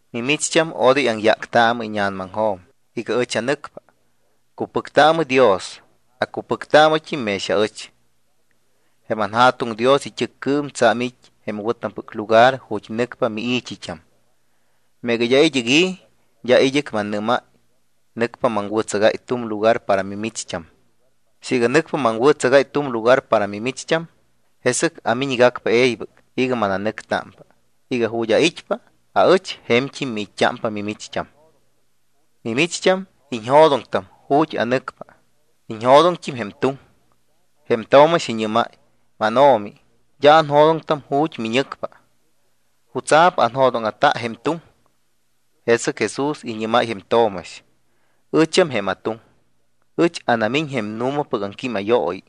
’Mimicht́am, odoy aŋyáctaamɨ íña̱namaŋjo̱m iga ɨch anɨcpa. Cupɨctaamɨ Dios, acupɨctaamɨt́im mex aɨch. Jém anJa̱tuŋ Dios it́ɨccɨɨm tsa̱m it́ jém wɨ̱tampɨc lugar ju̱t́ nɨcpa mii̱t́it́am. Meega d́a id́ɨc i̱, d́a id́ɨc mannɨ́máy. Nɨcpa maŋwɨ̱tsagáy tu̱m lugar para mimicht́am. Siiga nɨcpa maŋwɨ̱tsagáy tu̱m lugar para mimicht́am, jesɨc amiñgacpa e̱ybɨc iga mananɨctámpa, iga ju̱t́ ait́pa aɨch je̱mt́im miit́t́ámpa mimicht́am. Mimicht́am iñjo̱doŋtam ju̱t́ anɨcpa, iñjo̱doŋt́im jém tuŋ. Jém Tomax iñɨ́máy: —MánO̱mi, d́a anjo̱doŋtam ju̱t́ miñɨcpa. ¿Jutsa̱p anjo̱dóŋa̱ta jém tuŋ? Jesɨc Jesús iñɨ́máy jém Tomax: —Ɨcham jém atuŋ. Ɨch anamiñ jém nu̱mapɨc aŋquímayooyi.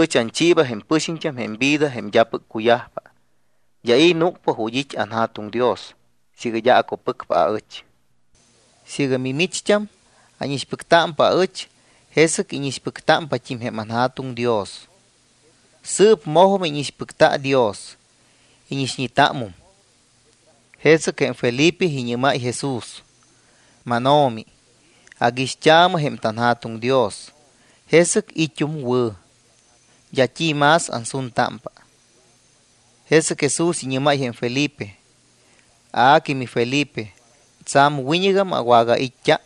Ɨch anchiiba jém pɨxiñt́am jém vida jém d́apɨc cuyajpa. D́a i̱ núcpa ju̱t́ it́ anJa̱tuŋ Dios siiga d́a acupɨcpa aɨch. Siiga mimicht́am ánixpɨctámpa aɨch, jesɨc íñixpɨctámpat́im jém anJa̱tuŋ Dios. Sɨɨp mojum íñixpɨcta Dios, íñixñetámum. Jesɨc jém Felipe iñɨ́máy Jesús: —MánO̱mi, aguixt́aamɨ jém tanJa̱tuŋ Dios, jesɨc it́um wɨ̱. D́a t́i más ansuntámpa. Jesɨc Jesús iñɨ́máy jém Felipe: —A que miFelipe, tsa̱m wiñɨgam awagait́t́a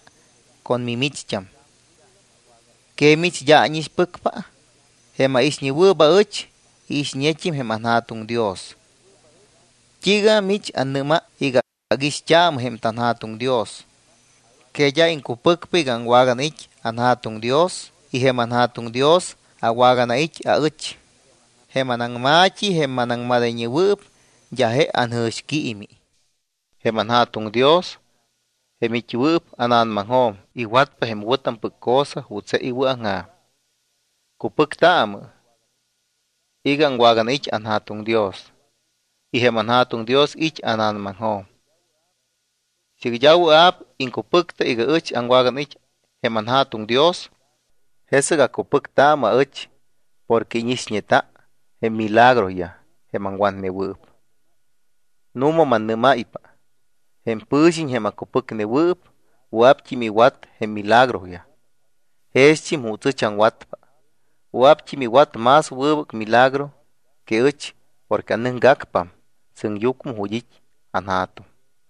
con mimicht́am. ¿Que mich d́a ánixpɨcpa? Jém aixñewɨɨp aɨch, iixñet́im jém anJa̱tuŋ Dios. ¿T́iiga mich annɨ́máy iga: “Aguixt́aamɨ jém tanJa̱tuŋ Dios”? ¿Que d́a iŋcupɨcpa iga aŋwaganait́ anJa̱tuŋ Dios y jém anJa̱tuŋ Dios awaganait́ aɨch? Jém anaŋma̱t́i, jém manaŋmadayñewɨɨp, d́a je anjɨ̱xquiimi. Jém anJa̱tuŋ Dios, jém it́wɨɨp ána̱namaŋjo̱m, iwatpa jém wɨ̱tampɨc cosa juuts je iwɨ̱aŋja̱m. Cupɨctaamɨ iga aŋwaganait́ anJa̱tuŋ Dios y jém anJa̱tuŋ Dios it́ ána̱namaŋjo̱m. Siiga d́a wɨa̱p iŋcupɨcta iga ɨch aŋwaganait́ jém anJa̱tuŋ Dios, jesɨc acupɨctaamɨ aɨch porque íñixñeta jém milagroyaj jém aŋwatnewɨɨp. Nu̱ma mannɨ́máypa; jém pɨ̱xiñ, jém acupɨcnewɨɨp, wɨa̱pt́im iwat jém milagroyaj jext́im juuts ɨch aŋwatpa, wɨa̱pt́im iwat más wɨbɨc milagro que ɨch porque anɨcgacpam sɨŋyucmɨ ju̱t́ it́ anJa̱tuŋ.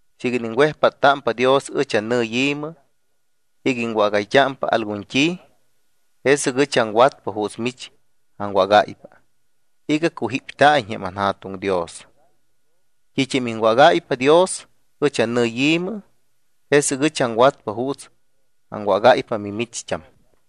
Siiga iniŋwejpáttámpa Dios ɨch annɨyi̱mɨ iga iŋwágayt́ámpa algun t́i, jesɨc ɨch aŋwatpa juuts mich aŋwágáypa iga cujípta̱iñ jém anJa̱tuŋ Dios. T́it́am iŋwágáypa Dios ɨch annɨyi̱mɨ, jesɨc ɨch aŋwatpa juuts aŋwágáypa mimicht́am.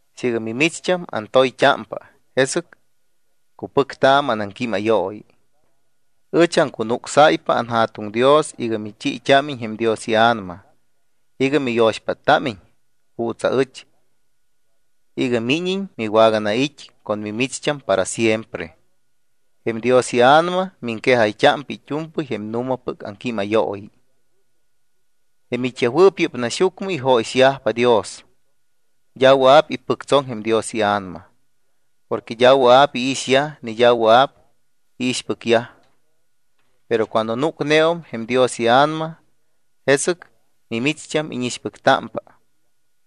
’Siiga mimicht́am antoyt́ámpa, jesɨc cupɨctaamɨ anaŋquímayooyi. Ɨch aŋcunucsáypa anJa̱tuŋ Dios iga michiit́ámiñ jém Dios iA̱nama iga miyo̱xpáttámiñt́im juuts aɨch iga míñiñ miwaganait́ con mimicht́am para siempre. Jém Dios iA̱nama miŋquejayt́ámpa it́u̱mpɨy jém nu̱mapɨc aŋquímayooyi. Jém it́yajwɨɨp yɨ́p naxyucmɨ ijóyixyajpa Dios, d́a wɨa̱p ipɨctsoŋ jém Dios iA̱nama, porque d́a wɨa̱p iixyaj ni d́a wɨa̱p iixpɨcyaj. Pero cuando núcneum jém Dios iA̱nama, jesɨc mimicht́am íñixpɨctámpa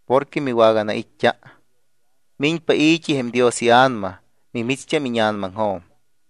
porque miwaganait́t́a. Miñpa i̱t́i jém Dios iA̱nama mimicht́am íña̱namaŋjo̱m.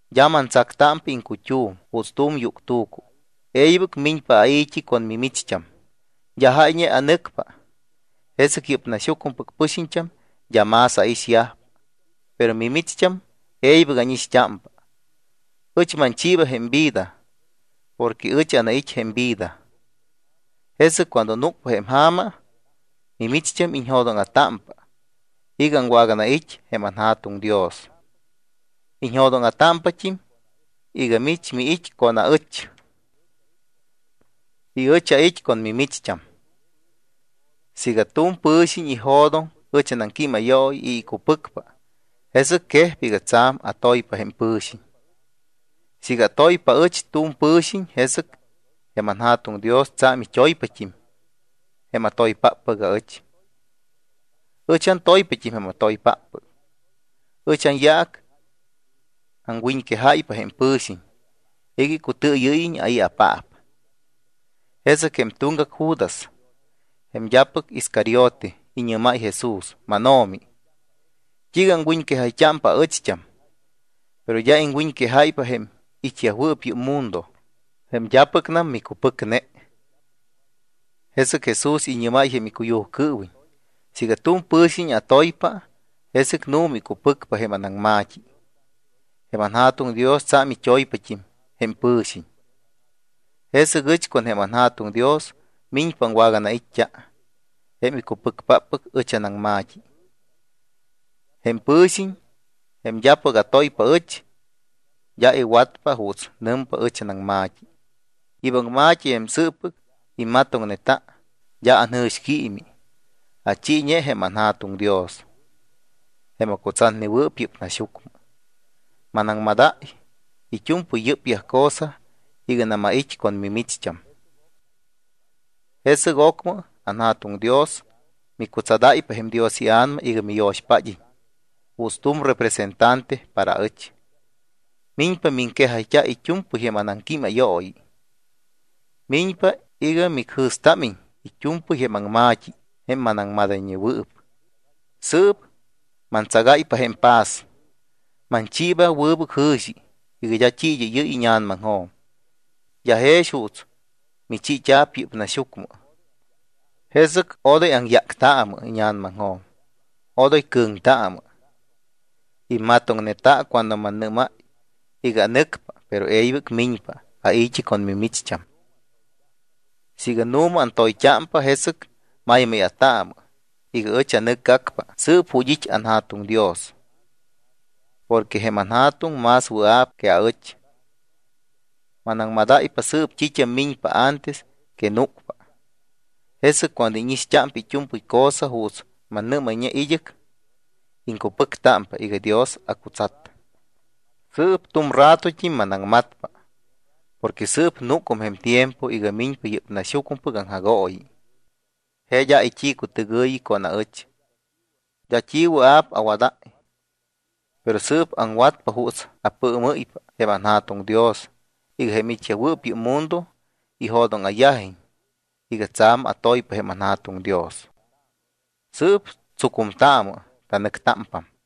D́a mantsactámpa iŋcut́um juuts tu̱m yuctu̱cu. E̱ybɨc miñpa ai̱t́i con mimicht́am. D́a jáyñe anɨcpa, jesɨc yɨ́p naxyucmɨpɨc pɨxiñt́am d́a más aixyajpa, pero mimicht́am e̱ybɨc ánixt́ámpa. Ɨch manchiiba jém vida porque ɨch anait́ jém vida. Jesɨc cuando núcpa jém ja̱ma, mimicht́am iñjo̱dóŋa̱támpa iga aŋwaganait́ jém anJa̱tuŋ Dios. Iñjo̱dóŋa̱támpat́im iga mich miit́ con aɨch y ɨch ait́ con mimicht́am. Siiga tu̱m pɨ̱xiñ ijo̱doŋ ɨch anaŋquímayooyi y icupɨcpa, jesɨc quejpa iga tsa̱m atoypa jém pɨ̱xiñ. Siiga atoypa aɨch tu̱m pɨ̱xiñ, jesɨc jém anJa̱tuŋ Dios tsa̱m it́oypat́im jém atoypáppɨc aɨch. Ɨch antoypat́im jém atoypáppɨc. Ɨch anyaac aŋwiñquejáypa jém pɨ̱xiñ iga icutɨɨyɨ́yiñ ai̱apaap. Jesɨc jém tuŋgac Judas, jém d́apɨc Iscariote, iñɨ́máy jém Jesús: —MánO̱mi, ¿t́iiga aŋwiñquejayt́ámpa aɨcht́am, pero d́a iŋwiñquejáypa jém it́yajwɨɨp yɨ́p mundo, jém d́apɨcnam micupɨcneyaj? Jesɨc Jesús iñɨ́máy jém icuyujcɨɨwiñ: —Siiga tu̱m pɨ̱xiñ atoypa, jesɨc nu̱ma icupɨcpa jém anaŋma̱t́i. Jém anJa̱tuŋ Dios tsa̱m it́oypat́im jém pɨ̱xiñ. Jesɨc ɨch con jém anJa̱tuŋ Dios miñpa aŋwaganait́t́a jém icupɨcpáppɨc ɨch anaŋma̱t́i. Jém pɨ̱xiñ, jém d́apɨc atoypa aɨch, d́a iwatpa juuts nɨmpa ɨch anaŋma̱t́i. Yɨ́p aŋma̱t́i, jém sɨɨppɨc immatoŋne, d́a anjɨ̱xquiimi; achiiñe jém anJa̱tuŋ Dios, jém acutsatnewɨɨp yɨ́p naxyucmɨ. ’Manaŋmadáy it́u̱mpɨy yɨ́pyaj cosa iganam ait́ con mimicht́am. Jesɨc ocmɨ anJa̱tuŋ Dios micutsadáypa jém Dios iA̱nama iga miyo̱xpád́iñ juuts tu̱m representante para ɨch. Miñpa miŋquejayt́a it́u̱mpɨy jém anaŋquímayooyi. Miñpa iga micjɨ̱stámiñ it́u̱mpɨy jém anaŋma̱t́i jém manaŋquejayñewɨɨp. ’Sɨɨp mantsagáypa jém paz, manchiiba jém wɨbɨc jɨ̱xi iga d́a t́i id́ɨ́yɨ́y íña̱namaŋjo̱m, d́a jex juuts michiit́a̱p yɨ́p naxyucmɨ. Jesɨc odoy aŋyáctaamɨ íña̱namaŋjo̱m, odoy cɨ̱ŋtaamɨ. Immatoŋneta cuando mannɨ́máy iga: “Anɨcpa, pero e̱ybɨc miñpa ai̱t́i con mimicht́am.” Siiga nu̱ma antoyt́ámpa, jesɨc maymáya̱taamɨ iga ɨch anɨcgacpa sɨɨp ju̱t́ it́ anJa̱tuŋ Dios, porque jém anJa̱tuŋ más wɨa̱p que aɨch. Manaŋmadáypa sɨɨp t́it́am miñpa antes que núcpa, jesɨc cuando íñixt́ámpa it́u̱mpɨy cosa juuts mannɨ́mayñe id́ɨc, iŋcupɨctámpa iga Dios acutsat. ’Sɨɨp tu̱m ratot́im manaŋmatpa, porque sɨɨp núcum jém tiempo iga miñpa yɨ́p naxyucmɨpɨc aŋjagooyi. Je d́a it́i̱cutɨgɨ̱yi con ɨch, d́a t́i wɨa̱p awadáy. Pero sɨɨp aŋwatpa juuts apɨɨmɨ́ypa jém anJa̱tuŋ Dios iga jém it́yajwɨɨp yɨ́p mundo ijo̱dóŋa̱yajiñ iga tsa̱m antoypa jém anJa̱tuŋ Dios. Sɨɨp tsucumtaamɨ. Tanɨctámpam.